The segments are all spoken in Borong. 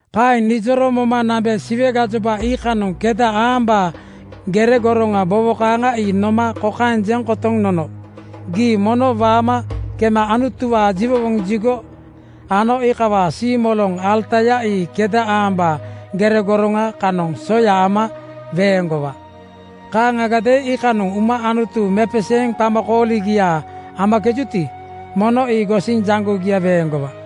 Kaeŋ nijoro moma nambe Siwe gajoba iikanoŋ keda aambaa gere goroŋa bowo kaaŋa ii noma kokaeŋ jeŋ kotoŋ nono, “Gii mono waama kema Anutuwaa jiwowoŋ jigo ano iikawaa siimoloŋ alataya ii keda aambaa gere goroŋa (rula mesa) kanoŋ soya ama weeŋgowa. Kaaŋagadeeŋ iikanoŋ uma Anutu mepeseeŋ qamakooligia amakejuti, mono ii gosiŋ jaŋgogia weeŋgowa.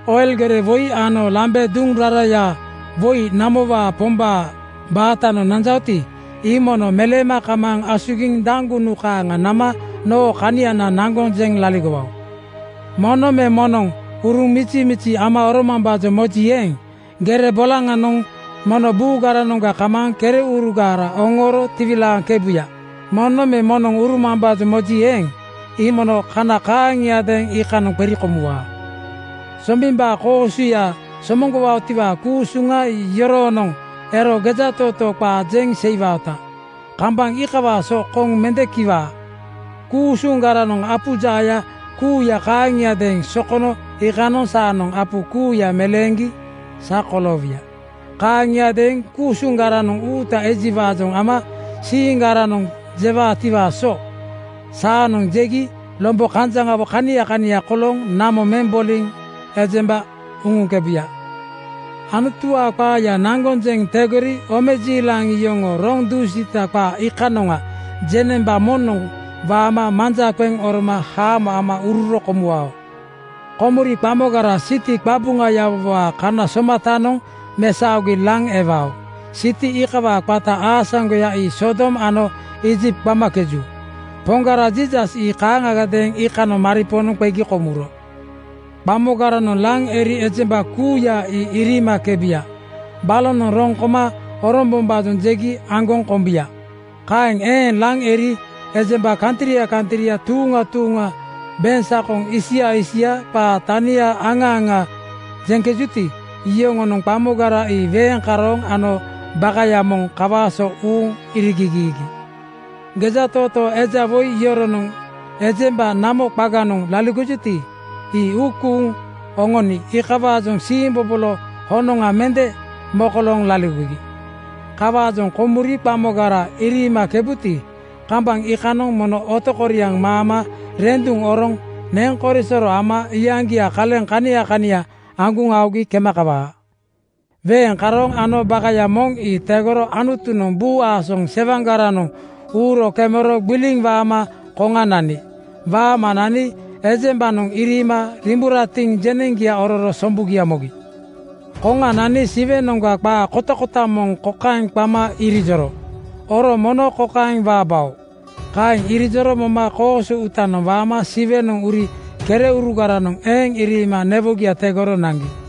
Oil gere woi ano lambe duŋ raraya woi namowaa Pombaa batanoŋ nanjaoti, ii mono meleema kamaaŋ asugiŋ daŋgunu kaaŋa nama noo kaniana naŋgoŋ jeŋ laligowao. Moŋnoŋ me moŋnoŋ uruŋ mizimizi ama oromambaajoŋ moji eeŋ, gere bolaŋanoŋ mono buugaranoŋga kamaaŋ kereurugara oŋooro tiwilaaŋkebuya. Moŋnoŋ me moŋnoŋ urumambaajoŋ moji eeŋ, ii mono kana kaaŋiadeeŋ iikanoŋ qeri komuwaa. Sombimbaa koosuya somoŋgowaotiwaa ku-usuŋa ii yoroonoŋ ero gejatootoo qaa jeŋ seiwaoti, kambaŋ iikawaa so koŋ mende kiwaa. Ku-usuŋgaranoŋ apu jaaya kuuya kaaŋiadeeŋ sokono iikanoŋ saanoŋ apu kuuya meleeŋgi sa koloowuya. Kaaŋiadeeŋ ku-usuŋgaranoŋ uuta ejiwaajoŋ ama siiŋgaranoŋ jewaatiwaa so saanoŋ jegi lombo kanjaŋawo kania kania kolooŋ namo meŋ boliŋ ejemba uŋuŋkebuya. Anutuwaa qaaya naŋgoŋ jeŋ tegori omejiilaŋ yoŋoo roŋ dusiita qaa iikanoŋa jeŋnemba moŋnoŋ waama manja qeŋ oroma haamo ama ururo komuwao. Komuri qamogara siti qabuŋayawowaa kana somatanoŋ oromesaogi laŋ ewao. Siti iikawaa qata aasaŋgoya ii Sodom ano Iijipt qamakeju. Poŋgara Jiisas ii kaaŋagadeeŋ iikanoŋ maripoonoŋ qegi komuro. Qamogaranoŋ laŋ eri ejemba kuuya ii iriimakebuya. Balonoŋ roŋ koma orombombaajoŋ jegi aŋgoŋ kombuya. Kaeŋ eeŋ laŋ eri ejemba kantria kantria, tuuŋa tuuŋa, beŋsakoŋ isia isia qaa tanigia aŋa aŋa jeŋkejuti, iyoŋonoŋ qamogara ii weeŋ karooŋ ano bakaya moŋ kawaa so uuŋ irigigiigi. Gejatootoo eja woi yoronoŋ ejemba namo qaganoŋ laligojuti, ii uu kuuŋ oŋoni iikawaajoŋ siimbobolo honoŋa mende mokolooŋ laligogi. Kawaajoŋ komuri qamogara iriimakebuti, kambaŋ iikanoŋ mono otokoriaŋ maama renduŋ oroŋ neŋ korisoro ama iyaŋgia kaleŋ kania kania aŋguŋ aogi kema kawaa. Weeŋ karooŋ ano bakaya moŋ ii tegoro Anutunoŋ buu aasoŋ sewaŋgaranoŋ uuro kemero gbiliŋ waama koŋa nani. Waama nani ejembanoŋ iriima riimburatiŋ jeneŋgia ororo sombugia mogi. Koŋa nani Siwenoŋga qa kotakota moŋ kokaeŋ qama irijoro, “Oro mono kokaeŋ waabao!” Kaeŋ irijoro moma koosu uutanoŋ waama Siwenoŋ uri kereurugaranoŋ eeŋ iriima newogia tegoro naŋgi.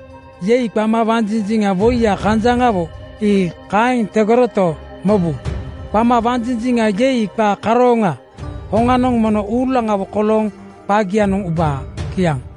‘Yei!’ qama wanjinjiŋa woiya kanjaŋawo ii kaeŋ tegoroto, mobu, qama wanjinjiŋ yei qa karooŋaa hoŋanoŋ mono uulaŋawo kolooŋ qagianoŋ ubaa. Kiaŋ.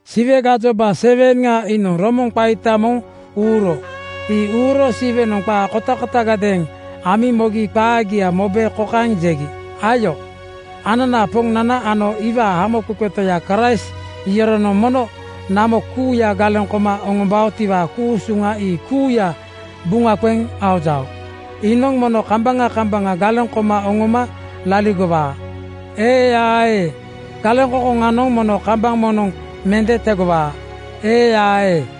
Siwe gajoba 7:ŋa iinoŋ romoŋa qaita moŋ (biugel) uuro. Ii uuro Siwenoŋ qaa kotakotagadeeŋ amiŋ mogi qagia mobe kokaeŋ jegi, “Ayo, ananaa Poŋnana ano iwaa Hamoqeqe Toya Kraist yoronoŋ mono namo kuuya galeŋ koma oŋombaotiwaa ku-usuŋa ii kuuya buŋa qeŋ aojao. Iinoŋ mono kambaŋa kambaŋa galeŋ koma oŋoma laligowaa, ee-aa-ee. Galeŋkoŋkoŋanoŋ mono kambaŋ moŋnoŋ mende tegowaa, ee-aa-ee.”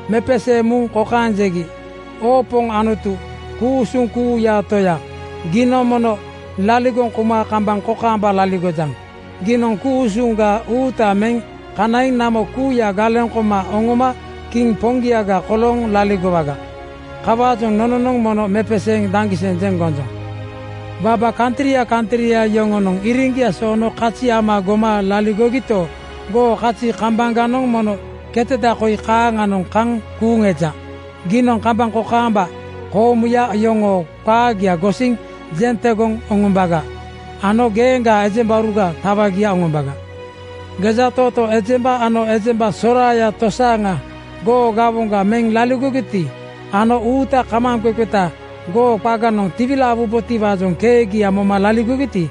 Mepeseeŋ muŋ kokaeŋ jegi, “Oo Poŋ Anutu ku-usuŋ kuuyaa Toya, giinoŋ mono laligoŋ kouma kambaŋ kokaamba laligojaŋ. Giinoŋ ku-usuŋga uuta meŋ kanaiŋ namo kuuya galeŋ koma oŋoma kiŋ poŋgiaga kolooŋ laligowaga. Kawaajoŋ nononoŋ mono mepeseeŋ daŋgiseŋ jeŋ gonjoŋ. Waba kantria kantria yoŋonoŋ iriŋgia soono kazi ama goma laligogito, goo kazi kambaŋganoŋ mono ketada koi kaaŋanoŋ kaŋ kuuŋ eja. Giinoŋ kambaŋ kokaamba koomuya yoŋoo qaagia gosiŋ jeŋ tegoŋ oŋombaga ano geeŋgaa ejembauruga tawagia oŋombaga. Gejatootoo ejemba ano ejemba soraaya tosaaŋa goo gawoŋga meŋ laligogiti ano uuta kamaaŋqeqeta goo qaganoŋ tiwilaawabotiwaajoŋ keegia moma laligogiti,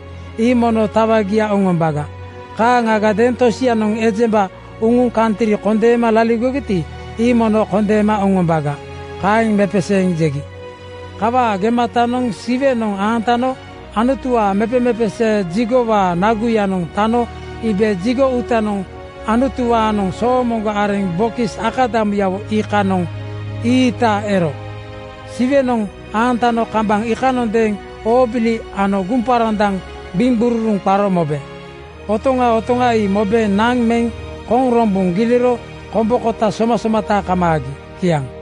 ii mono tawagia oŋombaga. Kaaŋagadeeŋ tosianoŋ ejemba uŋuŋ kantri kondeema laligogiti, ii mono kondeema oŋombaga.” Kaeŋ mepeseeŋ jegi. Kawaa gematanoŋ Siwenoŋ aantano Anutuwaa mepemepesee jigowaa (tempel) naguyanoŋ tano iibe jigo uutanoŋ Anutuwaanoŋ soomoŋgo areŋ bokis akadamuyawo iikanoŋ ii-iita ero. Siwenoŋ aantano kambaŋ iikanondeeŋ oobili ano guŋparandaŋ gbiŋgururuŋ qaro mobe. Otoŋa otoŋa ii mobe naŋ meŋ koŋ rombuŋ giliro kombo (ais) kota somasomata kamaagi. Kiaŋ.